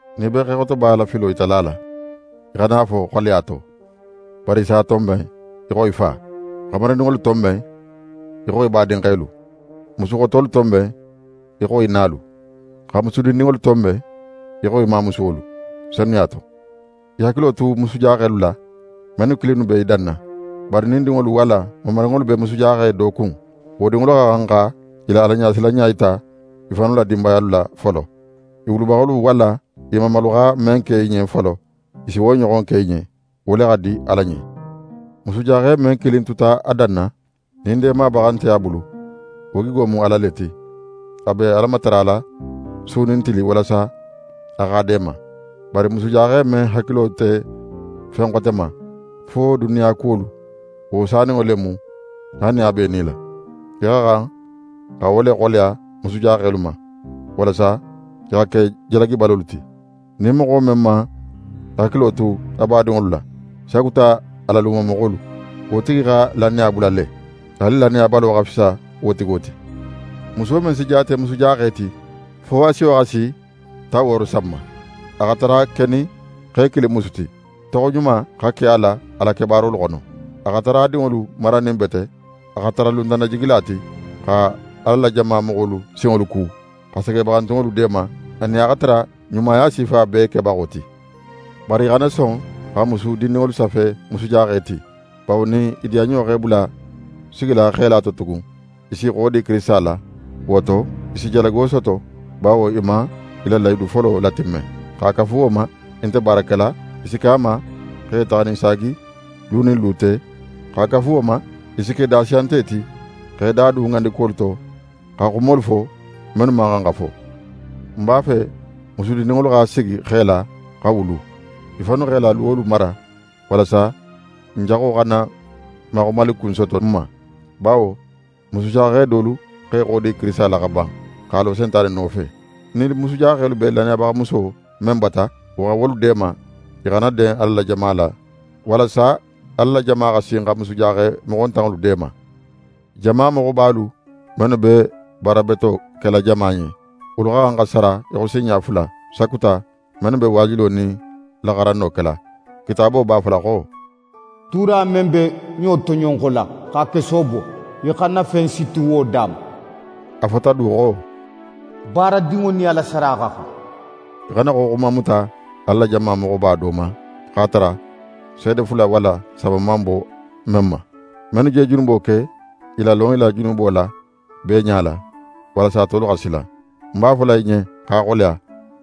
Nin í be xexotoba la filo yitala a la, í xana a fo xoleya to, bari í s'a tonben í xo í fa. Xamarindinŋolu tonben í xo í badinxelu. Musuxotolu tonben í xo í nalu, xa musu dindinŋolu tonben í xo í mamusuwolu, senuya to. Í hakilo tu musujaxelu la, mennu kilinnu be i danna. Bari nin dinŋolu walla mamarinŋolu be musujaxe do kun, wo dinŋolu xa xan xa i la Alaɲasilanɲa yita i fannu la dinbayalu la folo. I wulubaxolu walla i mamalu xa men ke i ɲen folo, i si wo ɲoxon ke i ɲen. Wo le xa di Ala ɲen. Musujaxe men kilin tuta a danna, nin deemabaxa nte a bulu, wo gigo mu Ala le ti. A be Ala matarala su nin tili walasa a x'a deema. Bari musujaxe men hakilo nte fen xote ma fo duniyadiya kuwolu, wo saninŋo le mu, haali nin a b'é nila. Í xa xan xa wo le xoleya musujaxelu ma, walasa i xa ke jalagibalolu ti. Nin moxo men man a hakilo tu a badinŋolu la, sakuta a la lumamoxolu, wo tigi xa lannaya bula le. Haali lannayabalo xa fisa wo tigo ti. Muso men si jaate musujaxe ti, fo a siyo xa si tan wooro san ma. A xa tara kenin xe kilin musu ti, toxoɲuma xa ke a la a la kebaarolu xono. A xa tara a dinŋolu maranin bete, a xa tara luntannajigila ti, xa Ala la jama moxolu sinŋolu ku, xa segebaxantunŋolu deema, anin a xa tara ɲumaya sifa bee kebaxo ti. Bari í xana son xa musu dindinŋolu safe musujaxe ti; bawo nin i diyanɲo x'e bula sigila xela to tugun, i s'i xodi Kirisita la. Wo to, i si jalago soto, bawo i man i la lahidu folo latimme. X'a kafu wo ma, i nte baara kela, i si ke a ma x'e taxaninsaagi lu nin lu te. X'a kafu wo ma, i si ke dasiyante ti x'e da dun ŋandikuwolu to, xa xumolu fo, mennu man xan xa fo. Ń b'a fe musu dindinŋolu xa sigi xela, xa wulu. I fannu x'e la luwolu mara, walasa n jaxo xana maxumalikun soto n ma. Bawo musujaxe dolu x'e xodi Kirisita la xa ban, x'a lo Sentane nofe. Nin musujaxelu be lannayabaxamuso men bata, wo xa wolu deema, i xana den Ala la jama la, walasa Ala la jama xa sin xa musujaxe moxontanŋolu deema. Jama moxobalu mennu be baara beto kela jama ɲen, wolu xa xan xa sara í xo sinɲa fula, sakuta mennu be waajulo nin laxaranno kela. Kitaabo b'a fola xo: «Tuura men be ɲo toɲonxola x'a keso bo, í xana fen siti wo da ma.» A fota du xo: «Baaradinŋo nin a la sara xa xan.» Í xana xoxuma muta Ala la jama moxoba do ma, x'a tara seede fula walla saba man bo men ma. Mennu je junubo ke, i lalon i la junubo la bee ɲala, walasa tolu xa sila. Ń b'a fola í ɲen x'a xoleya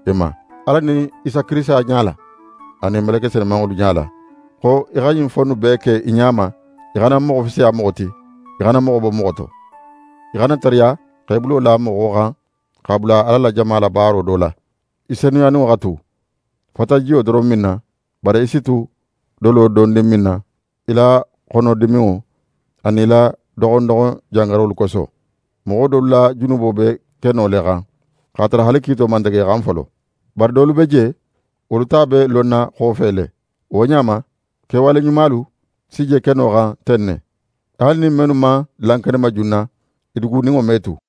í ma Ala nin Isa Kirisita ɲala, anin meleke senumanŋolu ɲala, xo í xa ɲin fo innu bee ke i ɲa ma. Í xana moxo fisiya moxo ti, í xana moxo bo moxo to. Í xana tariya xa í bulo la moxo xan, x'a bula Ala la jama la baaro do la. Í senuyaninŋo xa tu. Fata jiyo doron minna, bari í si tu dolo dondin minna í la xonodiminŋo anin í la doxon doxon jangarolu koso. Moxo dolu la junubo be keno le xan x'a tara haali kiito man tege i xan folo. Bari dolu be je, wolu ta be lonna xofe le. Wo ɲa ma, kewale ɲumalu si je keno xan ten ne. Haali nin mennu man lankenema junna, i duguninŋo me tu.